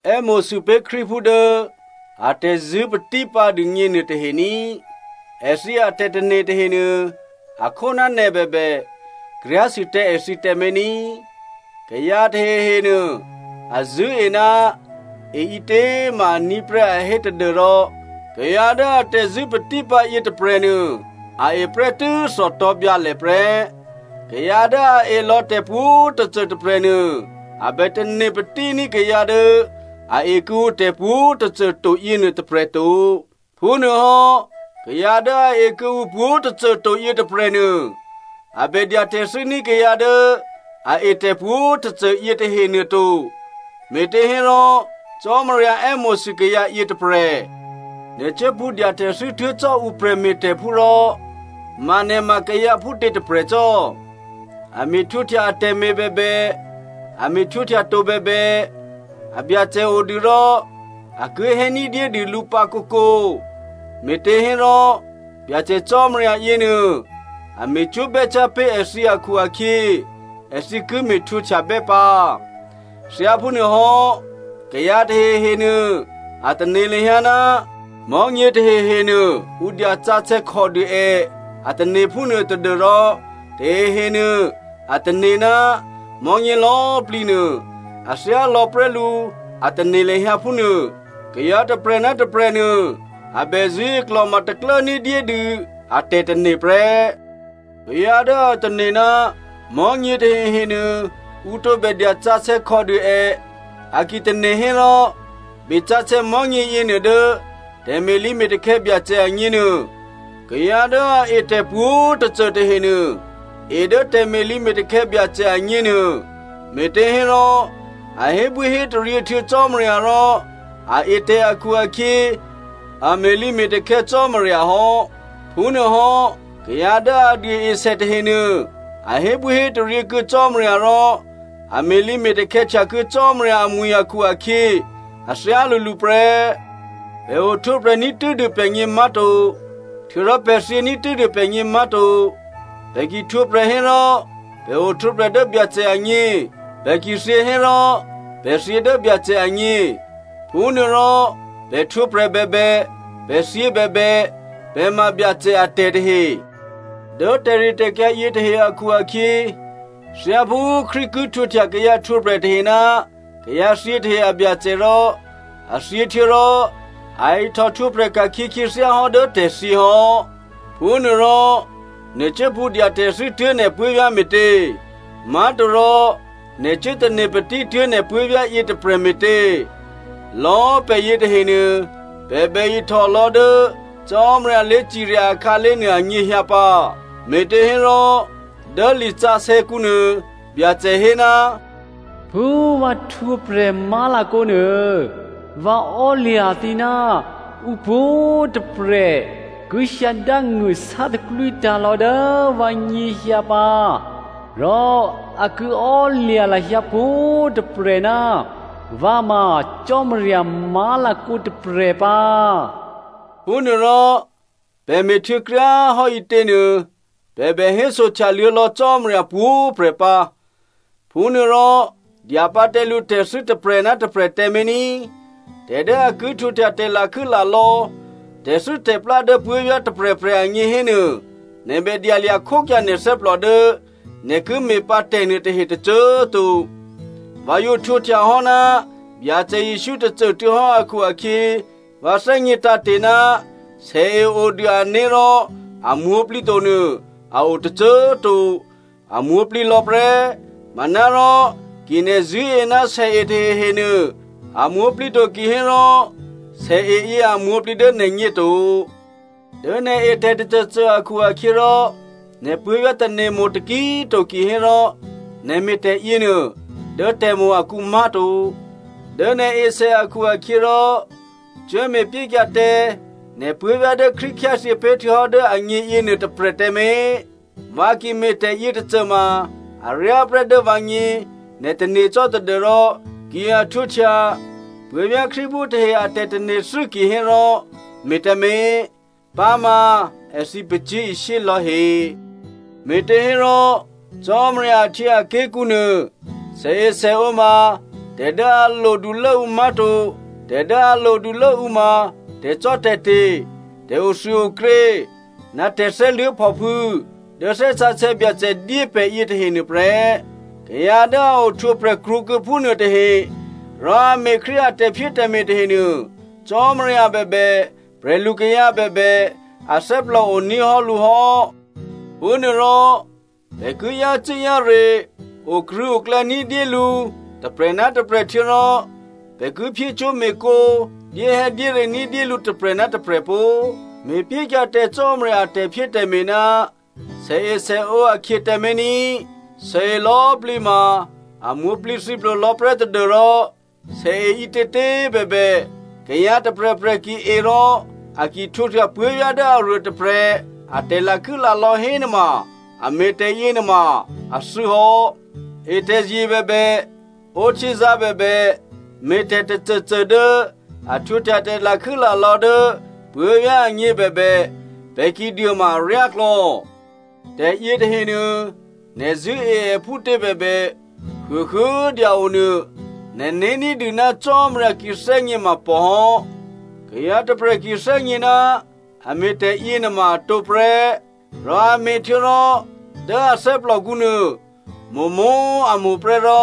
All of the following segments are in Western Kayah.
È́mo̤sû pé̤ Krístuphú dố atè̤zṳ̂́ patípǎ dûgně nuôtahe ní꤮. Èthǐ atè̤tane̤ tahenuô, a khó ná nè̤ bèbè, kryá̤sû tǎ èthǐ tǎmé̤ ní꤮. Kayǎ tahehenuô a zṳ̂́e ná e ǐtě꤮ ma aní̤ prè́ a hé tadû́rò kayǎ dố atè̤zṳ̂́ patípǎ yětôprè̤nuô a e prè́tû́ thòtò̤̌byǎlè prè́. Kayǎ dố a e lò̌ tè̤pwǒ̤꤮ tôcô tôprè̤nuô, a bè tane̤ patíní̤ kayǎ dố a e kuô̌ǔ tè̤pwǒ̤꤮ tôcô to yěnuô tôprè̤ to. Phúnuôhò́ kayǎ dố a e kuô̌ǔ pwǒ̤꤮ tôcô to yětôprè̤nuô, a bè dya tè̤thû́ ní̤ kayǎ dố a e tè̤pwǒ̤꤮ tôcô yětahenuô to, me̤těhérò Cò́marya è́mo̤sû kayǎ yětôprè̤. Nè̤ cuố pṳ̌ dya tè̤thû́ tuố̤ cò́ ǔ prè̤me̤tè̤phú rò ma nè̤ ma kayǎ phútě tôprè̤ cò́? A me̤ htwǒhtya atè̤me̤ bèbè, a me̤ htwǒhtya to bèbè, abyacè odû rò a ki hé ní̤dyédû lǔ pǎ kǒkǒ, me̤těhérò Byacè Cò́marya yěnuô, a me̤cwó̤ bè́cyá̤ pé̤ èthǐ akhu-akhyě, èthǐ ki me̤htwǒhtyabè́ pǎ. Thyáphúnuôhò́, kayǎ tahehenuô a tane̤ lahyǎ, mò̤́nyě tahehenuô ǔ dya sǎsè̌ khòdû è a tane̤ phúnuô tadû́rò tahehenuô a tane̤ ná mò̤́nyě lò̌꤮ plǐ nuô a thyálò̌ prè́ lǔ a tane̤ lahyǎ phúnuô. Kayǎ tôprè̤ ná tôprè̤ nuô, a bè zṳ̂́e klò̤ma taklố ní̤dyédû a tè̤tane̤ prè́. Kayǎ dố a tane̤ ná mò̤́nyě tahehenuô, ǔ tǒbè dyasǎsè̌ khòdû è a ki tane̤ hérò, besǎsè̌ mò̤́nyě yěnuô dố tè̤me̤lǐme̤takhè̌ Byacè agněnuô. Kayǎ dố a e tè̤pwǒ̤꤮ tôcô tahenuô, e dố tè̤me̤lǐme̤takhè̌ Byacè agně nuô, me̤těhérò a hébwíhétaryě htuô̌ Cò́marya rò a e tè̤ akhu-akhyě a me̤lǐme̤takhè̌ Cò́marya hò́. Phúnuôhò́ kayǎ dố a duôesè tahenuô, a hébwíhétaryě kuô̌ Cò́marya rò a me̤lǐme̤takhè̌ htyakuô̌ Cò́marya amwi̤ akhu-akhyě a thyálǔlǔ prè́. Pè̤ ohtwǒprè̤ ní̤tû́dû pè̤gně má̤to. Htuô̌rò pè̤ thyění̤ tû́dû pè̤gně má̤to. Pè̤ ki htwǒprè̤ hérò, pè̤ ohtwǒprè̤ dố Byacè agně. Pè̤ ki thyě hérò pè̤ thyě dố Byacè agně. Phúnuôrò pè̤ htwǒprè̤ bèbè, pè̤ thyě bèbè, pè̤ ma Byacè atè̤ tahe. Dố tè̤ritè̤kyǎ yětahe akhu-akhyě, thyáphú Krístu ki htwǒhtya kayǎ htwǒprè̤ tahe ná kayǎ thyě tahe a Byacè rò, a thyě htuô̌rò a ihtòhtwǒprè̤ ka̤khyě khyěthyá hò́ dố tè̤thyě hò́. Phúnuôrò, nè̤ cuố pṳ̌ dya tè̤thû́ tuố̤ nè̤ puố̤vyá̤ me̤tě? Má̤torò, nè̤ cuố tane̤ patítuố̤ nè̤ puố̤vyá̤ yětôprè̤ me̤tě? Lò̌꤮ pè̤ yětahenuô, pè̤ bè ihtòlò̌ dố Cò́marya lé̤cirya akhǎlé̤ nuô anyěhyǎ pǎ. Me̤těhérò, dố lisǎsè̌kǔ nuô, Byacè hé, “Phú vǎ htwǒprè̤ má̤lakǒ nuô, vǎ ò́lya̤ thǐ, ǔpwǒ̤꤮ tôprè̤ ki hyǎ dángṳ̂ sátaklwítǎ̤ lò̌ dố vǎ nyěhyǎ pǎ rò a ki ò́lya̤ lahyǎ pwǒ̤꤮ tôprè̤ ná vǎ ma Cò́marya má̤lakǒ tôprè̤ pǎ.” Phúnuôrò, pè̤ me̤htuô̌ kryá꤮ hò́ ǐtěnuô pè̤ bè hésohtyaluô̌ lò̌ Cò́marya pwǒ̤꤮ prè̤ pǎ. Phúnuôrò, dya pǎ tǎ lǔtè̤thû́ tôprè̤ ná tôprè̤ tǎmé̤ ní꤮. Tè̤ dố a ki htwǒhtya tè̤lakhû́lalò̌, tè̤thû́tè̤plá dố puố̤vyá̤ tôprè̤prè̤ agně hénuô, nè̤ bè dyalya̤ khókyǎ nè̤ thè́plò dố nè̤ ki me̤pǎ tè̤nuôtahe tôcô꤮ to. Vǎ yǒ htwǒhtya hò́ ná Byacè Jesǔ tôcô꤮ tuô̌hò́ akhu-akhyě, vǎ thè́gně tǎ̤te̤ ná sèe odû ané̤ rò a mwǒ̤plǐ tonuô a o tôcô꤮ to. A mwǒ̤plǐ lò̌ prè́. Manárò ki nè̤ zṳ̂́e ná sèe tahehenuô a mwǒ̤plǐ to kihérò sèeyě a mwǒ̤plǐ dố nè̤gně to. Dố nè̤ e tè̤tôcôcô akhu-akhyěrò, nè̤ puố̤vyá̤ tane̤mo̤ taki꤮ to kihérò, nè̤ me̤ tè̤yěnuô dố tè̤mo̤ akǔ má̤to. Dố nè̤ esè akhu-akhyěrò cuốme̤pyékyǎ tǎ nè̤ puố̤vyá̤ dố Krístu khyáthyě pé̤ htuô̌hò́ dố agně yěnuô tôprè̤ tǎmé̤. Vǎ ki me̤ tè̤yětôcô ma aryá prè́ dố vǎgně, nè̤ tane̤ cò́ tadû́rò, ki a htwǒhtya puố̤vyá̤ Krístuphú tahe a tè̤tane̤thû́ kihérò me̤ tǎmé̤. Pǎma èthǐ pacyé̤ishyé lò̌he. Me̤těhérò, Cò́marya ahtyěaké̤kǔ nuô, sèesèǒ ma tè̤ dố a lodulốǔ má̤to. Tè̤ dố a lodulố ǔ ma, tè̤cò́tè̤te̤, tè̤othuôokrě, ná tè̤thè́luố̤phòphû̌ dố Thè́ Sǎsè̌ Byacè dyé pè̤ yětahe nuôprè́. Kayǎ dố a ohtwǒprè̤ krwǒkuô̌ phúnuô tahe, rò a me̤ Krístu a tè̤phyétè̤me̤ tahenuô, Cò́marya bèbè prè̤lukayǎ bèbè athè́plò oní̤ hò́ lǔ hò́. Phúnuôrò, pè̤ ki yácû́-yáre okrṳ̂̌oklè̌ ní̤dyé lǔ tôprè̤ ná tôprè̤ htuô̌rò pè̤ ki phyécwó̤me̤cwó̤, dyéhè̌dyére ní̤dyé lǔ tôprè̤ ná tôprè̤ pó꤮. Me̤pyékyǎ tǎ Cò́marya a tè̤phyétè̤me̤ ná sèesèǒ akhyě tǎmé̤ ní꤮. Sèe lò̌꤮ plǐ ma a mwǒ̤plǐthǐplo lò̌ prè́ tadû́rò sèe ǐtětě꤮ bèbè, kayǎ tôprè̤prè̤ ki e rò a ki htwǒhtya puố̤vyá̤ dố aruô tôprè̤ a tè̤lakhû́lalò̌ hénuôma, è me̤ tè̤yěnuôma a thû́hò́. E tè̤zye bèbè, ǒ htyězǎ̤ bèbè, me̤tè̤ tôcôcô dố a htwǒhtya tè̤lakhû́lalò̌ dố puố̤vyá̤ agněbèbè, pè̤ ki duô ma aryáklò̌. Tè̤ yětahenuô, nè̤ zṳ̂́e è phútě bèbè, huôhuô꤮ dya-o nuô, nè̤né̤ ní̤dû ná Cò́marya ki thè́gně ma pòhò́. Kayǎ tôprè̤ ki thè́gně ná a me̤ tè̤yěnuôma a tǒprè́, rò a me̤htuô̌rò dố a thè́plòkǔ nuô, mo̤mo̤꤮ a mo̤ prè́, rò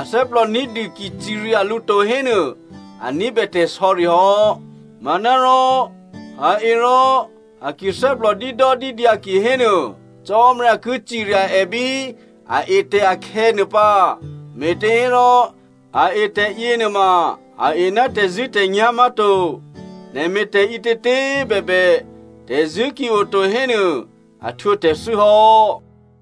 athè́plò ní̤dû ki cirya lǔ to hénuô, a ní̤bè tè̤sò̌ri hò́. Manárò a e rò a ki thè́plò dídòdídyǎ kihénuô Cò́marya ki cirya è bí a etè̤ akhè̌nuô pǎ, me̤těhérò a e tè̤yě nuôma a e ná tè̤zṳ̂́tè̤nyá̤ má̤to. Nè̤ me̤ tè̤ǐtětě꤮ bèbè, tè̤zṳ̂́ ki oto hénuô a htwǒ tè̤thû́ hò́.